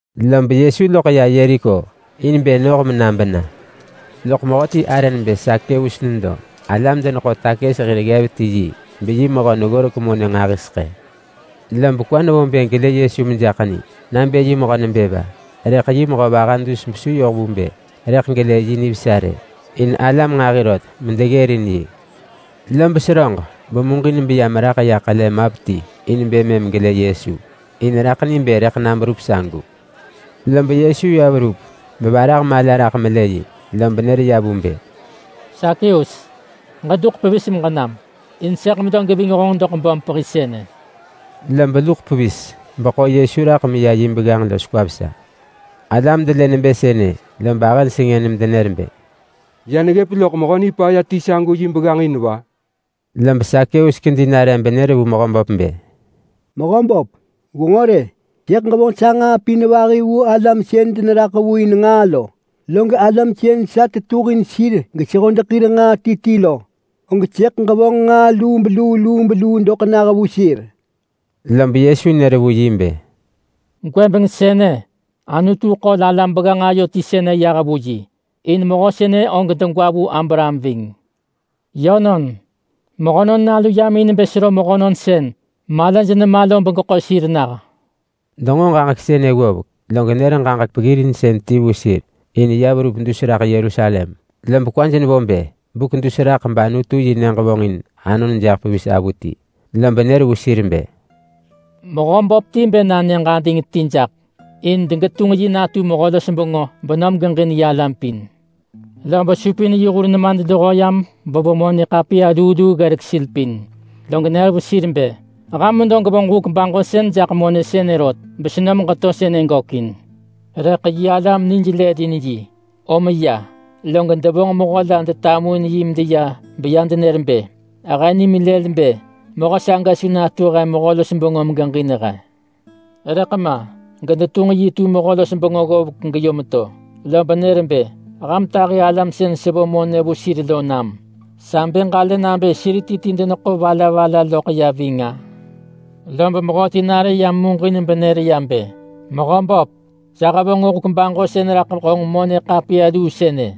Lob Yesu loḳ ya Yeriko in bë noh na bena. Loḳ mehöti arë nebë Sakeus nedo. Alam-deneḳo-takës hir ggev ti yi, beyi mehö neggorek monë nġahiseḳë. Lob kwa nevo bë gelë Yesu mejaḳ ni nabë yi mehö nebë va. Rëḳ yi mehö vaha dus besu yoh vu bë rëḳ gelë yi nivesa rë, in alam nġahi rot medeggërin yi. Lob seröġ bemuġin beya meraḳ ya ḳele map ti in bë mëm gelë Yesu. In raḳ ni bë rëḳ na berup sagu. Lob Yesu ya verup bevarah mala raḳ melë yi, lob nër ya vu bë, “Sakeus, ġeduḳ pevis meġenam! In sëḳ medo geving honġ doḳ böm pehi sënë.” Lob luḳ pevis beḳo Yesu raḳ meya yi begganġ los kwa vesa. Alam delë nebë sënë, lob ahëj sengën medenër bë, “Ya neggëp loḳ mehö nipaya ti sagu yi begganġ in va?” Lob Sakeus ya nare benër vu Mehöböp bë, “Mehöböp, gwenġo rë. Sëḳ ġevonġ sa nġaa pin vahi vu alam sën deneraḳ vu in nġaa lo. Log alam sën sa tetuhin sir gesehodeḳ hir nġaa ti ti lo, og sëḳ ġevonġ nġaa lubeluu lubeluu doḳ nah vu sir.” Lob Yesu nër vu yi bë, “Gwëbeng sënë, Anutu ḳol alam begganġ ayo ti sënë yah vu yi. In mehö sënë og degwa vu Abraham ving. Yönon, Mehönon Nalu yam in bë sero mehönon sën malaj nema lo begeḳo sir nah.” Denġo ġaġek sënë ggovek, log nër ġaġek peggirinsën ti vu sir. In ya verup dus raḳ Yerusalem, lob kwaj nevo bë buk dus raḳ bAnutu-yi-nyëġ vonġin anon jaḳ pevis avuti. Lob nër vu sir bë, “Mehö böp ti bë na nyëġ ading ti jaḳ in degetunġ yi natu mehö-los-bengö benom geġin yi alam pin. Lob supin yi hur nemadluho yam bevo monë ḳapiya luu luu ggelek sir pin, log nër vu sir bë, ‘Ham medo gwevonġ huk baġosën jaḳ monë sënë rot, besenom geto sënë gökin.’ Rëḳ yi alam nij nelëlin yi, om ya, log devonġ mehö la detamuin yi medeya beya denër bë, ‘He nimin lël bë mehö saga su natu he mehö-los-bengö megeġin he!’ Rëḳ ma gedetunġ yi tu hir mehö-los-bengö ggovek geyom to. Lob nër bë, ‘Ham tahi alam sën sevo monë vu sir lo nam. Sa bë ġalë nabë sir ti ti deneḳo va la va la loḳ ya ving-a?’ Lob mehöti nare yam muġin benër ya bë, ‘Mehö böp, sa hevonġ huk baġosën raḳ honġ monë ḳapiya luu sënë,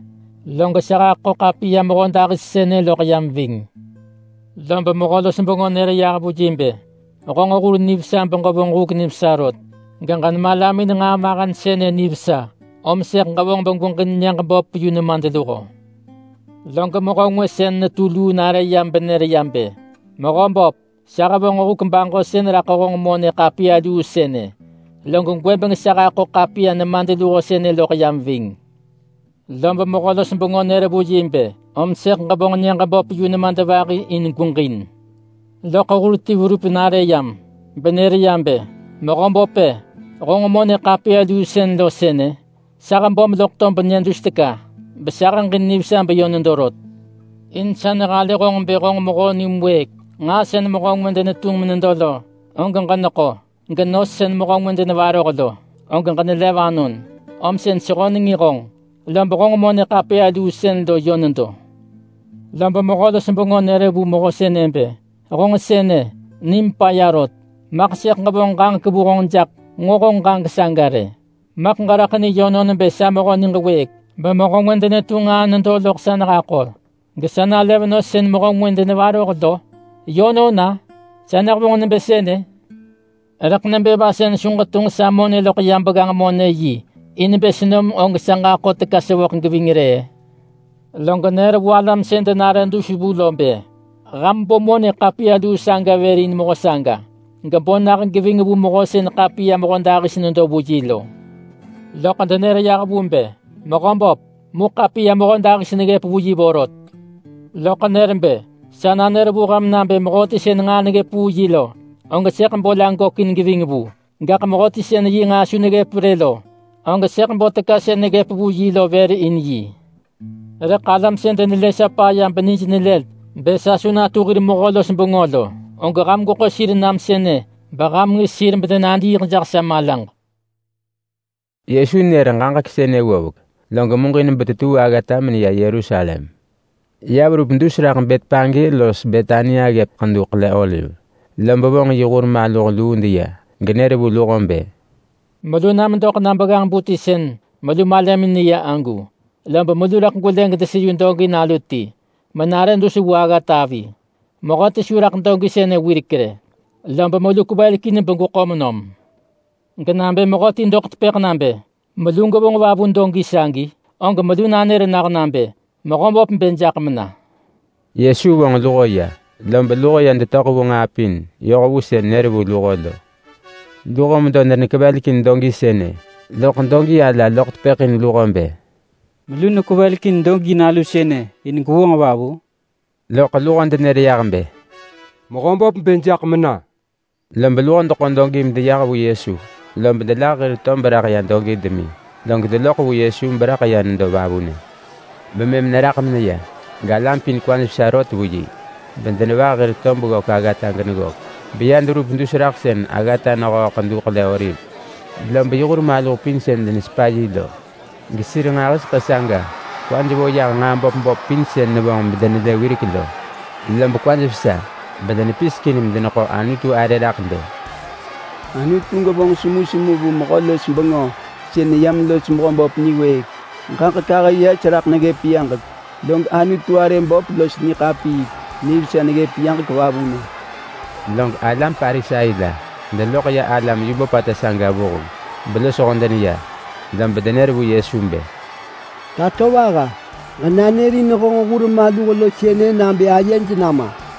log sa haḳo ḳapiya mehödahis sënë loḳ yam ving.’ Lob mehö-los-bengö nër vu yi bë, ‘Honġ hur nivesa beġevonġ huk nivesa rot. Ġenemalamin nġaa mahen sënë nivesa, om sëḳ ġevonġ begweġin nyëġ böp yu nemadluho.’ Log mehö ngwë sën netu luu nare benër ya bë, ‘Mehö böp, sa hevonġ huk baġosën raḳ honġ monë ḳapiya luu sënë, log gwëbeng sa haḳo ḳapiya nemadluho sënë loḳ yam ving.’ Lob mehö-los-bengö nër vu yi bë, ‘Om sëḳ ġevonġ nyëġ böp yu nemadvahi in gweġin.’ Loḳ hur ti verup nare yam, benër ya bë, ‘Mehö böp, honġ monë ḳapiya luu sën lo sënë. Sa hebom loḳ tob nyë dus teka besa heġin nivesa beyö nedo rot. In sa nehalë honġ bë honġ mehö nim wëëk. Nġaa sën mehö ngwë denetunġ menedo lo, og ġeneḳo. Genos sën mehö ngwë denevaroh lo, og ġenelev anon. Om sën sehönengin honġ, lob honġ monë ḳapiya luu sën lo yö nedo.’ Lob mehö-los-bengö nër vu mehö sënë bë, ‘Honġ sënë, nim paya rot! Maḳ sëḳ ġevonġ ġaġek vu honġ jaḳ nġo honġ ġaġek saga rë. Maḳ ġeraḳ ni yönon bë sa mehö niġ wëëk, bemehö ngwë denetunġ nġaa nedo loḳ sa nehako, gesa nalev nos sën mehö ngwë denevaroh lo? Yönon-a? Sa nehevonġ nebë sënë? Rëḳ nebë va sën su ġetunġ sa monë loḳ ya begganġ-monë-yi in bë senom og sa ġaḳo teka sevöḳ geving rë-ë?’ Log nër vu alam sën denare dus vu lo bë, ‘Ham bo monë ḳapiya luu saga vër in mehö saga, gebo nah geving vu mehö sën ḳapiya mehödahis nedo vu yi lo.’ Loḳ denër yah vu bë, ‘Mehö böp, mu ḳapiya mehödahis neggëp vu yi vorot.’ Loḳ nër bë, ‘Sa nanër vu ham nabë mehöti sën nġaa neggëp vu yi lo, og sëḳ bo la gökin geving vu. Gaḳ mehöti sën yi nġaa su neggëp rë lo, og sëḳ bo teka sën neggëp vu yi lo vër in yi. Rëḳ alam sën denelë sa paya benij lël bë sa su natu hir mehö-los-bengö lo, og ham gweḳo sir nam sënë beham ngis sir bedenadiiḳ jaḳ sa malaġ.’” Yesu nër ġaġek sënë ggovek, log muġin betetuu aggata meneya Yerusalem. Ya verup dus raḳ Betpage los Betania ggëp Ḳedu Ḳele-oliv, lob vonġ yi hur maluh luu deya, genër vu luho bë, “Melu na medoḳ na begganġ-bu ti sën melu malamin neya agu, lob melu rëḳ gwelë gedeseyu dogi nalu ti menare dus vu aggata avi. Mehöti su raḳ dogi sënë wirek rë, lob melu kwevelekin begweḳo nom. Genabë mehöti doḳ tepëḳ nabë, ‘Melu gwevonġ va vu dogi sagi?’ og melu nanër nah nabë, ‘Mehöböp bë jaḳ mena’.” Yesu vonġ luho ya, lob luho ya detöḳ vu nġaa pin yoh vu sën nër vu luho lo. Luho medo denekevelekin dogi sënë, loḳ dogi ala loḳ tepëḳ in luho bë, “Melu nekwevelekin dogi nalu sënë in gwevonġ va vu?” Loḳ luho denër yah bë, “Mehöböp bë jaḳ mena.” Lob luho deḳo dogi medeya vu Yesu. Lob delah hir tob raḳ ya dogi demi, log detunġ Yesu raḳ ya nedo vavunë. Bemëm neraḳ meneya, galam pin kwaj vesa rot vu yi bedenevah hir tob ggök aggata geneggök, beya deverup dus raḳ sën aggata nehöö Ḳedu Ḳele-oliv. Lob yi hur maluh pin sën denesepa yi lo, gesir nġahiseḳë saga kwaj vo yah nġaa böp böp pin sën nevonġ bedenelë wirek lo, lob kwaj vesa bedenepisekin medeneḳo Anutu arë raḳ bë: “Anutu gevonġ semusemu vu mehö-los-bengö sën neyam los Mehöböp niwëëk! Ġaġek ahë yes raḳ neggëp yaġek, log Anutu arë böpata los niḳapiik nivesa neggëp yaġek vavunë!” Log alam Parisai la deloḳ ya alam yu böpata saga vuheng belosho deneya, lob denër vu Yesu bë, “Tatovaha, ġenanërin honġ hur maluh lo sënë nabë ayej nama.”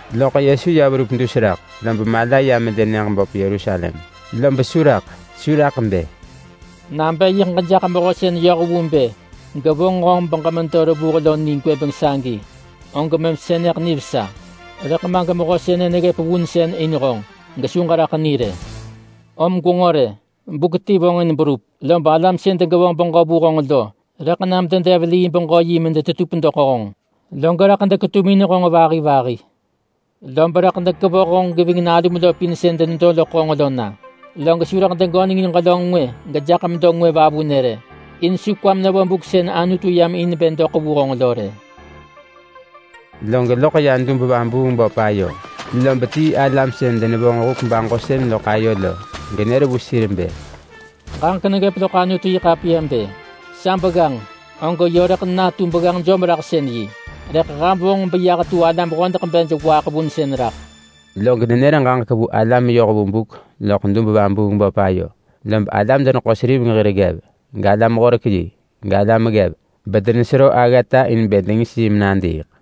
Loḳ Yesu ya verup dus raḳ, lob mala ya melë nyëġ böp Yerusalem, lob su raḳ. Su raḳ bë, “Nabë yiḳ ġejaḳ mehö sën yoh vu bë gevonġ honġ beġemedo revuh lo ni gwëbeng sagi, og mëm sënë nivesa. Rëḳ ma gemehö sënë neggëp vunsën in honġ, gesu ġeraḳ ni rë. Gwenġo rë, buk ti vonġin berup, lob alam sën degevonġ beġö vu honġ lo rëḳ nam dedev lii beġö yi medetetup doḳ honġ. Log rëḳ deketumin honġ vahi vahi. Lob rëḳ dekevoh honġ geving nalum lo pin sën denedo loḳ honġ lo na. Log su rëḳ degönengin ġelönġ ngwë gejaḳ medo ngwë vavunë rë. In su kwam nevo buk sën Anutu yam in bë doḳ vu honġ lo rë.” Log loḳ ya dub-vabuung-böp ayo, lob tii alam sën denevonġ huk baġosën loḳ ayo lo. Genër vu sir bë, “Ġaġek neggëp loḳ Anutu-yi-ḳapiya bë: Sa begganġ, og yö rëḳ natu begganġ jom-raḳsën-yi. Rëḳ ham vonġ beyah tu alam hodeḳ bej waaḳ vunsën raḳ.” Log nenër ġaġek vu alam yoh vu buk loḳ dub-vabuung-böp ayo. Lob alam-deneḳo-seriveng hir ggev, galam-horek-yi, galam ggev, bedenesero aggata in bë dengis yi menadiiḳ.